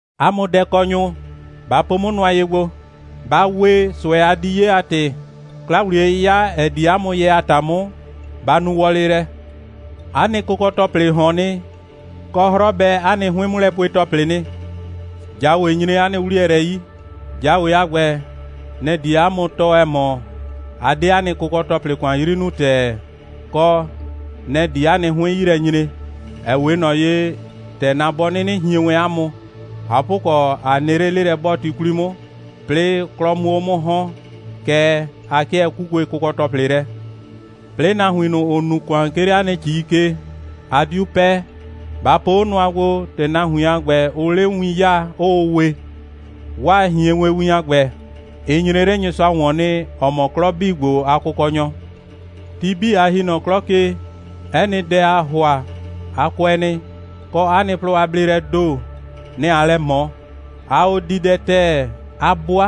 'A mʋ dɛkɔnyʋ, ba po 'mʋ nʋa ye gbo! Ba we, ꞊sʋɛ a di 'ye a ‑tɩ, 'kla‑wliye'yɩya, ‑ɛ di 'a mʋ yɛ a ‑ta 'mʋ, ba nu wɔlɩ lɛ. 'A nɩ kʋkɔ‑tɔplɩ ꞊hɔn nɩ, kɔ, 'hrɔ bɛ 'a nɩ 'hʋɩn'mʋlɛpue‑tɔplɩ nɩ. ꞊Jawe nyre 'a nɩ 'wliyɛ lɛ 'yi. ꞊Jawe a ‑gbɛ, nɛ‑ die 'a mʋ tɔɔ, ‑ɛ mɔ, a 'de 'a nɩ kʋkɔ‑tɔplɩ ‑kʋan 'yri nuu ‑tɛɛ, kɔ, nɛ‑ di 'a nɩ 'hʋɩn 'yi lɛ nyre, ‑ɛ 'we ꞊nɔ ye, ‑tɛ na bɔ 'nɩnɩ hien wɛn 'a mʋ. ꞊Hapʋkɔ, ꞊a nɩ 'le 'lelɛ'bɔɔti 'kwli 'mʋ, 'plɩɩ 'klɔ 'mʋ 'o 'mʋ ‑hɔn, kɛɛ, a 'kɩɛ 'kukue kʋkɔ‑tɔplɩ lɛ. 'Plɩɩ, nahuin ꞊nʋ, ‑ʋ nu ‑kʋan, 'ke 'le 'a nɩ ‑cii ke, a 'diu 'pɛɛ. Ba po 'o nʋa gbo, ‑tɛ nahuin a ‑gbɛ, ʋʋ 'le win 'yaa, 'ʋʋ we. 'Waa ꞊hienwewin a ‑gbɛ, ɩ nyre 'le Nyɩsʋa ‑wɔn nɩ, ‑ɔ mɔ 'klɔ 'bii ‑gbo a Kʋkɔnyɔ. Ti 'bii, a ‑hi nɔ 'klɔ ke, 'ɛ nɩ dɛ, aa ‑hʋa, a kʋɛ nɩ, kɔ, 'a nɩ plɔ a bleelɛɛ ‑do, nɛ‑ aa lɛ ꞊mɔ. Aa o di dɛ ‑tɛɛ, 'a 'bʋa,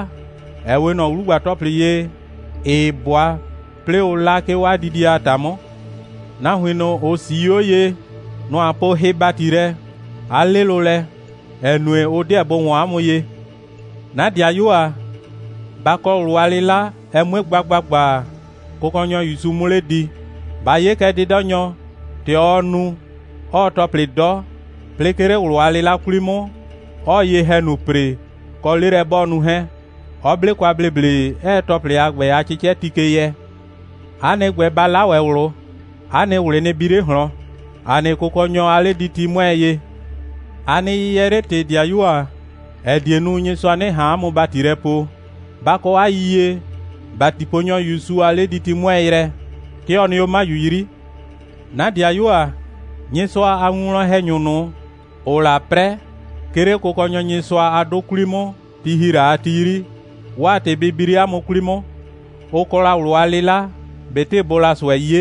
‑ɛ 'we ꞊nɔ 'wlugba‑tɔplɩ ye, ‑ɩɩ 'bʋa, 'plɩɩ ʋʋ 'la, 'ke 'o 'a didie a ‑ta 'mʋ. Nahuin ꞊nʋ, ‑ʋ 'sii 'o ye, nʋ‑ a poo hɩ‑bati lɛ, 'a 'lɩlʋ lɛ, ‑ɛ nue, ʋ 'deɛ bʋ ‑wɔn 'a mʋ ye. 'Na ‑dɩayuo ‑a, ba kɔ ꞊wlʋ a 'lɩla, ɛ 'mue gba ‑gbagba, Kʋkɔnyɔ ‑Yusu 'mʋ 'le di. Ba 'ye kɛ 'dɩdɔnyɔ, ‑tɛ ɔɔ nu, 'ɔɔ ‑tɔplɩ 'dɔ, 'plɩɩ 'ke 'le ꞊wlʋ a 'lɩla 'kwli 'mʋ, 'ɔɔ ye‑hɛnu ‑pre, kɔ, 'lelɛ'bɔɔnu 'hɛɛn, 'ɔ 'ble kwa ‑bleble, 'ɛɛ ‑tɔplɩ a ‑gbɛ a 'cɩcɛti ke yɛ. 'A nɩ ‑gbɛ, ba 'la ‑wɛ ꞊wlʋ. 'A nɩ ꞊wlɩ nɩ bi 'le ꞊hlɔn. ‑A nɩ Kʋkɔnyɔ a 'lediti 'mʋɛɛ ye. A nɩ yɩyɛɛ 'le ‑tɩ, ‑dɩayuo ‑a, ‑ɛ die nu, Nyɩsʋa 'nɩ ꞊han 'a mʋ ‑bati lɛ poo. Ba kɔ 'a yiyie, ‑batiponyɔ ‑Yusu a 'lediti 'mʋɛɛ yrɛ, 'ke ɔ nɩ 'o 'maju 'yri. 'Na ‑dɩayuo ‑a, Nyɩsʋa a winwlɔn‑hɛnyʋ ꞊nʋ, ‑ʋʋ la 'prɛ, 'ke 'le Kʋkɔnyɔ Nyɩsʋa a 'dʋ 'kwli 'mʋ, ti ‑hi la a ti 'yri, 'waa ‑tɩ bɩ bi 'le 'a mʋ 'kwli 'mʋ. Ʋ kɔ la ꞊wlʋ a 'lɩla, ꞊betɩ bʋʋ la ꞊sʋɛ 'ye.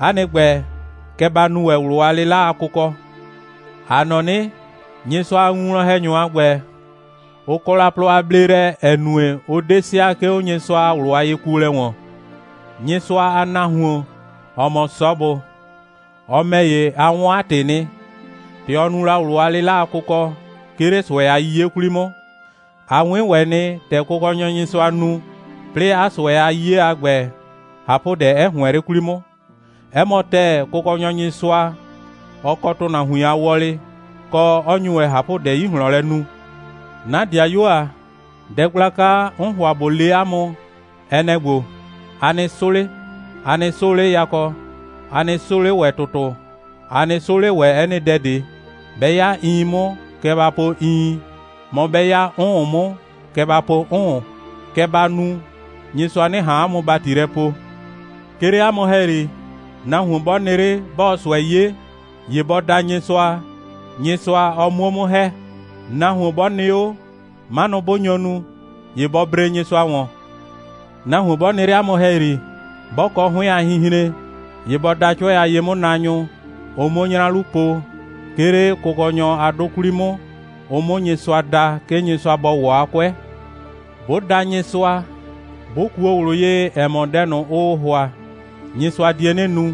'A nɩ ‑gbɛ, kɛ ba nu ‑wɛ ꞊wlʋ a 'lɩla a kʋkɔ. ‑A nɔ 'nɩ, Nyɩsʋa a winwlɔn‑hɛnyʋ a ‑gbɛ, ʋ kɔ la plɔ a bleelɛ, ‑ɛ nue, ʋ 'de sɩa, 'ke 'o Nyɩsʋa a ꞊wlʋ a yekuolɛ ‑wɔn. Nyɩsʋa a nahuon, ‑ɔ mɔ Sɔbʋ, ɔ ‑mɛ ‑ye, a 'wɔn 'a ‑tɩ nɩ, ‑tɛ ɔ nu la ꞊wlʋ a 'lɩla a kʋkɔ, 'ke 'le ꞊sʋɛ a 'yiye 'kwli 'mʋ. A 'wɩn ‑wɛ nɩ, ‑tɛ Kʋkɔnyɔ Nyɩsʋa nu, 'plɩɩ 'a ꞊sʋɛ a 'yiye a ‑gbɛ, ꞊hapʋdɛ 'ɛ ‑hʋɛn 'le 'kwli 'mʋ. 'Ɛ mɔ ‑tɛɛ, Kʋkɔnyɔ Nyɩsʋa, ɔ kɔ ‑tʋnahuin a wɔlɩ, kɔ, 'ɔ nyu ‑wɛ ꞊hapʋdɛ 'yi ꞊hlɔn lɛ nu. 'Na ‑dɩayuo ‑a, dɛ gblaka, 'n ‑hʋa ꞊bo le 'a mʋ, ɛ nɛ‑ ‑gbo: A nɩ 'sʋ 'le! A nɩ 'sʋʋ 'le yakɔ, a nɩ 'sʋʋ 'le ‑wɛ ‑tʋtʋ, a nɩ 'sʋʋ 'le ‑wɛ 'ɛ nɩ dɛ ꞊de. 'Bɛ 'ya iin 'mʋ, kɛ ba po iin, mɔ, 'bɛ 'ya 'ʋʋn 'mʋ, kɛ ba po 'ʋʋn. Kɛ ba nu, Nyɩsʋa 'nɩ ꞊han 'a mʋ ‑bati lɛ poo. 'Ke 'le 'a mʋ ‑hɛyri, nahuon 'bɔ nɩ 'le, 'bɔɔ ꞊sʋɛ 'ye, ‑ye bɔ da Nyɩsʋa, Nyɩsʋa ɔ 'muo 'mʋ ‑hɛ. Nahuon 'bɔ nɩ 'o, 'manʋ 'bʋ nyo nu, ‑ye bɔ bree Nyɩsʋa ‑wɔn. Nahuon 'bɔ nɩ 'le 'a mʋ ‑hɛyri, 'bɔ kɔ 'hʋɩn a hinhren, ‑ye bɔ da 'cʋɛ a ye'mʋnaanyʋ, ʋ 'muo 'nyra 'lu po, 'ke 'le Kʋkɔnyɔ a 'dʋ 'kwli 'mʋ, ʋ 'mʋ Nyɩsʋa da, 'ke Nyɩsʋa bɔ ‑wɔ 'a 'kʋɛ. 'Bʋ da Nyɩsʋa, 'bʋ kuo ꞊wlʋ ye, ‑ɛ mɔ, dɛ ꞊nʋ, ʋʋ ‑hʋa, Nyɩsʋa die 'nɩ nu,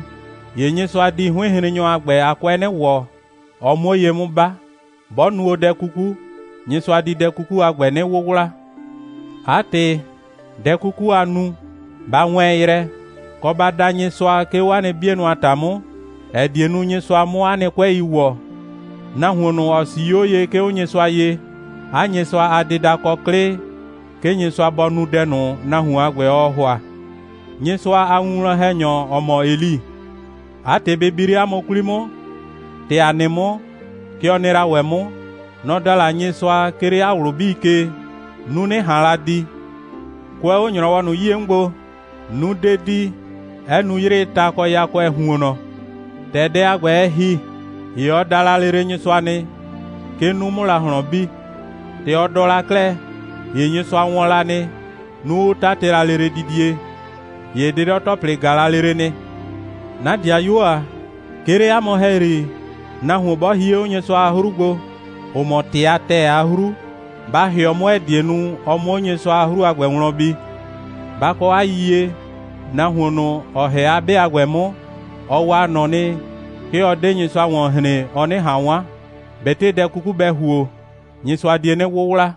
‑ye Nyɩsʋa di 'hʋɩnhrennyɔ a ‑gbɛ a 'kʋɛ 'nɩ ‑wɔ, ɔ 'muo ye 'mʋ 'ba. 'Bɔ nu o dɛ 'kuku, Nyɩsʋa di 'a dɛ 'kuku a ‑gbɛ 'nɩ 'wʋwla. 'A ‑tɩ, dɛ 'kuku, a nu, ba wɛɛn yrɛ, kɔ, ba da Nyɩsʋa, 'ke 'o 'a nɩ 'bienʋ a ‑ta 'mʋ, ‑ɛ die nu, Nyɩsʋa 'mʋ 'a nɩ 'kʋɛi ‑wɔ. Nahuon ꞊nʋ, ‑ɔ 'sii 'o ye, 'ke 'o Nyɩsʋa ye, 'a Nyɩsʋa a dɩda kɔ 'klɩ, 'ke Nyɩsʋa bɔ nu dɛ ꞊nʋ, nahuon a ‑gbɛ, ɔɔ ‑hʋa. Nyɩsʋa a winwlɔn‑hɛnyɔ, ‑ɔ mɔ Eli, 'a ‑tɩ bɩ bi 'le 'a mʋ 'kwli 'mʋ. ‑Tɛ ‑a nɩ 'mʋ, kɛ ɔ nɩ la ‑wɛ 'mʋ. Nɔ‑ da la Nyɩsʋa, 'ke 'le 'a ꞊wlʋ 'bii ke, 'nu 'nɩ ꞊han la di. Kʋɛ 'o ‑nyrɔwɔ ꞊nʋ 'yie 'mʋ gbo, 'nu 'de di, 'ɛ nu 'yrɩɩ ta kɔ yakʋɛɛ ‑huonnɔ. ‑Tɛ dɛ a ‑gbɛ, ɛ ‑hi, ‑ye ɔ da la lele Nyɩsʋa nɩ, 'ke 'nu 'mʋ la ꞊hlɔn bi. ‑Tɛ ɔ dɔ la 'klɛɛ, ‑ye Nyɩsʋa wɔn la nɩ, 'nu 'ʋ 'tatɩ la lele didie, ‑ye 'dɩdɔ‑tɔplɩ ꞊ga la lele nɩ. 'Na ‑dɩayuo ‑a, 'ke 'le 'a mʋ ‑hɛyri, nahuon 'bɔ hie 'o Nyɩsʋa a 'hru gbo, ‑ʋ mɔ ‑tɩ a ‑tɛɛ a 'hru, ba ‑hɩɔ 'mʋ, ‑ɛ die nu, ɔ 'mʋ 'o Nyɩsʋa a 'hru a ‑gbɛ wlɔn bi. Ba kɔ 'a yiyie, nahuon ꞊nʋ, ‑ɔ ‑hɛ 'a 'be a ‑gbɛ 'mʋ, ɔ waa ꞊nɔ nɩ, 'ke ɔ 'de Nyɩsʋa ‑wɔn hren, ɔ 'nɩ ꞊han 'wan. ꞊Betɩ dɛ 'kuku bɛ ‑huo, Nyɩsʋa die 'nɩ 'wʋwla.